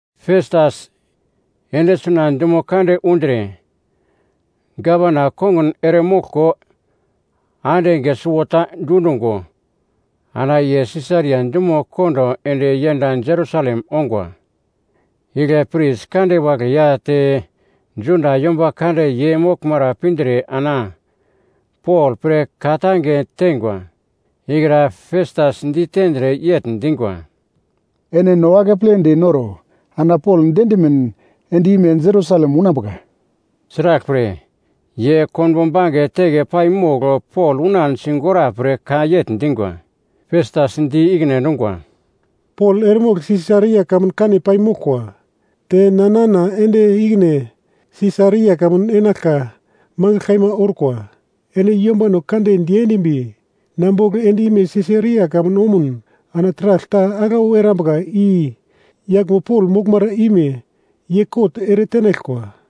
Festas ende suna dumo kande undre gavana kongun eremoglko ande enge suwota dundungo ana ye Sisaria dumo kondo ende yend Jerusalem ongwa. Igle pris kande wagle ya te Juda yomba kande ye moglmara pindre ana Pol pre ka-tange tengwa ikra Festas ditendre yegl dingwa, “Ene no akepledi noro ana Pol diendimin end-ime Jerusalem unambuka.” Sraglpre, ye konbo bange teke paimogl Pol unan sigora pre ka yegl dingwa. Festas di ikine endungwa, “Pol eremogl Sisaria kamun kane paimoglkwa, te na nana ende ikine Sisaria kamun enaglka magl kaima orkwa. Ene yombano kande diendimbi na bogl end-ime Sisaria kamun omun ana taragl ta aglau erambuka i yaglmo Pol moglmara ime ye kot eretenaglkwa.”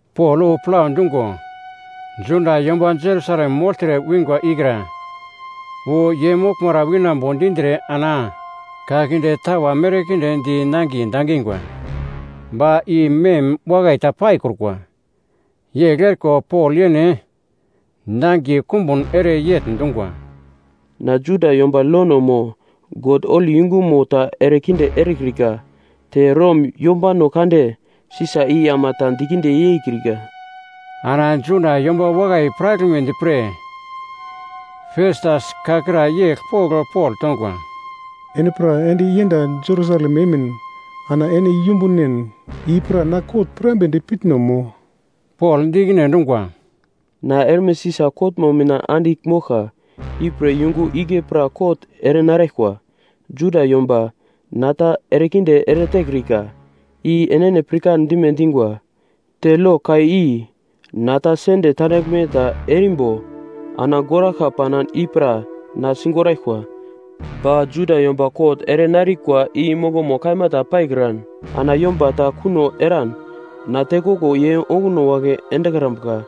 Pol wu plau dungo, Juda yomba Jerusalem mogltre wingwa ikra wu ye moglmara winambo dindre ana ka kinde tawa merkinde di nangiye dangingwa, ba i mem wakai ta paikrukwa. Yegl eriko Pol yene nangiye kumbun ere yegl dungwa, “Na Juda yomba lono mo God holi yungumo ta erekinde erekrika, te Rom yombano kande Sisa i ama ta dikinde yeikrika.” Ana Juda yomba wakai piraglmedi pre Festas ka kra yegl pogl Pol tongwa, “Ene pra ende yend Jerusalem emin ana ene yumbunen i pra na kot pirambedi pitno mo?” Pol di ikine endungwa, “Na erme Sisa kotmo mina andigl moglka, ipre yungu igle pra kot erenaraglkwa. Juda yomba na ta erekinde eretekrika, i enene pirkan dime dingwa. Te lo ka i na ta sende tandaglme ta erimbo ana goraglka panan i pra na sigoraglkwa. Ba Juda yomba kot erenarikwa i mongomo kaima ta paikran ana yomba ta kuno eran na tekoglo ye onguno wagle endekrambuka.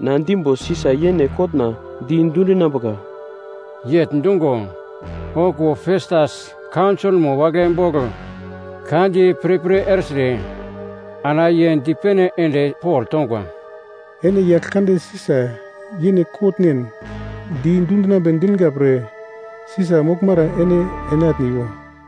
Na dimbo Sisa yene kotna di dundinambuka.” Yegl dungo, okuwo Festas kaunsolmo wagle bogl ka di pirpir ertre ana ye dipene ende Pol tongwa, “Ene yagl kande Sisa yene ene kotnen di dundinambe dinga pre Sisa moglmara ene enatniwo.”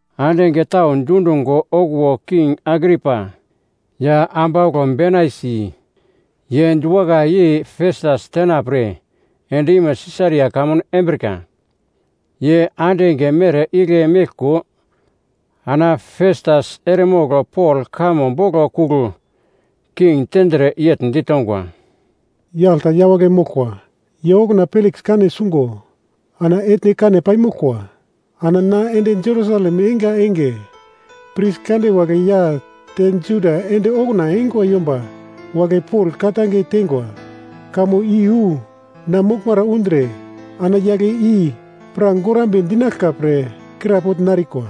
Ande enge tau dundungo okuwo King Agripa ya ambauglo Benaisi, ye diwakai yei Festas tenapre end-ime Sisaria kamun embrika. Ye ande enge mere igle meglko ana Festas eremogl Pol kamo boglo kugl king tendre yegl ditongwa, “Yagl ta yawagle moglkwa, ye okuna Peliks kane sungo ana etne kane paimoglkwa. Ana na ende Jerusalem einga enge, pris kande wagle ya te Juda ende okuna eingwa yomba wagle Pol ka-tange tengwa kamo iyu na moglmara undre ana yagle i pra gorambe dinaglka pre krapogl narikwa.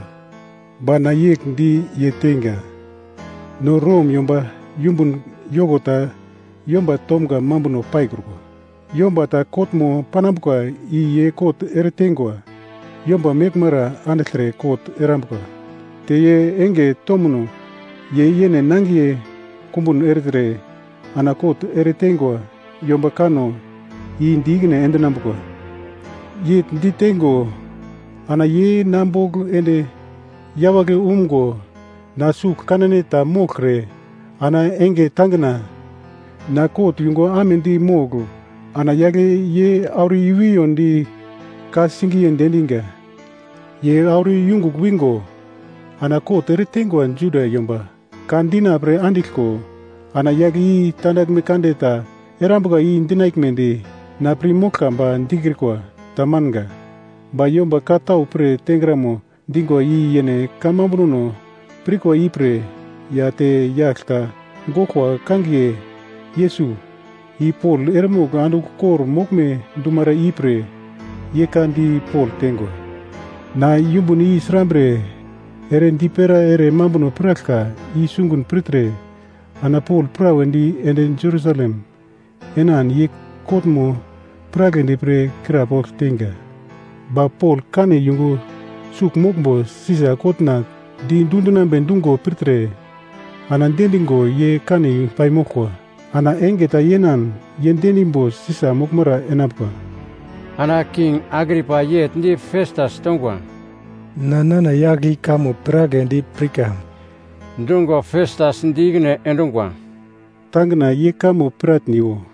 “Ba na yegl di ye teinga, ‘No Rom yomba yumbun yoko ta yomba tomga mambuno paikrukwa. Yomba ta kotmo panambuka i ye kot ereteingwa yomba meglmara andigltre kot erambuka, te ye enge tomno ye yene nangiye kumbun ertre ana kot ereteingwa yomba kanno i di ikine endinambuka.’ Yegl diteingo ana ye na bogl ende yawagle umgo na sugl kanan ta moglkre ana enge tangina na kot yungu amedi mogl ana yagle ye auro i-wiyondi ka-singiye diendinga. Ye auro yungugl wingo ana kot ereteingwa Juda yomba ka dina pre andiglko ana yagle i tandaglme kande ta erambuka i dinaglmedi na pir moglka ba dikrikwa, tamanga. Ba yomba ka tau pre tengramo dingwa i yene kamambunono pirkwa ipre ya te yagl ta goglkwa kangiye Yesus, i Pol eremogl andigl kor-moglme dumara ipre ye ka di Pol tengwa. Na yumbun i srambre ere dipera ere mambuno piraglka i sungun pirtre ana Pol prawedi ende Jerusalem enan ye kotmo piragledi pre krapogl teinga. Ba Pol kane yungu sugl moglmbo Sisa kotna di dundinambe dungo pirtre ana diendingo ye kane paimoglkwa. Ana enge ta yenan ye diendimbo Sisa moglmara enambuka.” Ana King Agripa yegl di Festas tongwa, “Na nana yagl i kamo piragledi pirka.” Dungo Festas di ikine endungwa, “Tangina ye kamo piratniwo.”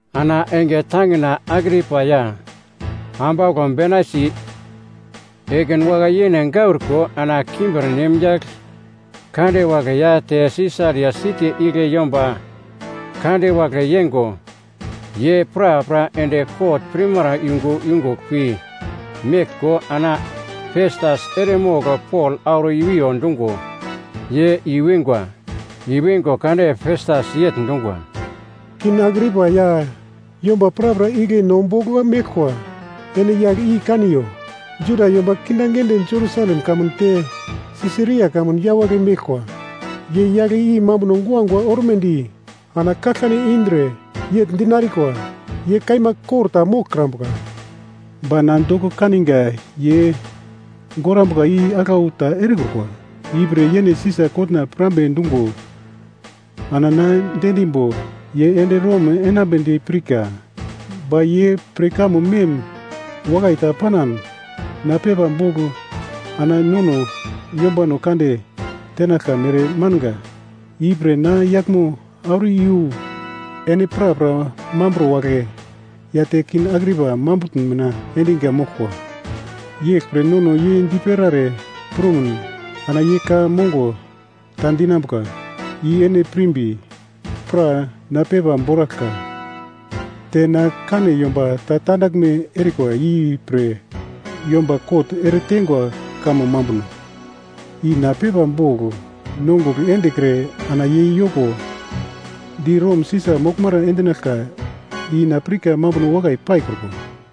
Ana enge tangina Agripa ya ambauglo Benaisi ekin wakai-yene gauriko ana kimbirnem yagl kande wagle ya te Sisaria siti igle yomba kande wagle yengo ye prapra ende kot pirmara yungu yungugl pi meglko ana Festas eremogl Pol auro i-wiyo dungo, ye i-wingwa. I-wingo kade Festas yegl dungwa, “King Agripa ya yomba prapra igle no bogl meglkwa ene yagl i kaniyo! Juda yomba kindaginde Jerusalem kamun te Sisaria kamun yawagle meglkwa, ye yagl i mambuno guagua ormedi ana kaglkane indre yegl dinarikwa, ‘Ye kaima kor ta moglkrambuka.’ Ba na doko kaninga ye gorambuka i aglau ta erekrukwa. Ipre yene Sisa kotna pirambe dungo ana na diendimbo ye ende Rom enambedi pirka. Ba ye pre kamo mem wakai ta panan na pepa bogl ana nono Yombano Kande tenaglka mere manga. Ipre na yaglmo auro iyu ene prapra mambro wagle ya te King Agripa mambutn mina endinga moglkwa. Yeglpre nono ye dipera ere prumun ana ye ka mongo ta dinambuka i ene pirmbi, pra na pepa boraglka. Te na kane yomba ta tandaglme erikwa ipre yomba kot eretengwa kamo mambuno i na pepa bogl nongugl endekre ana ye yoko di Rom Sisa moglmara endinaglka i na pirka mambuno wakai paikrukwa.”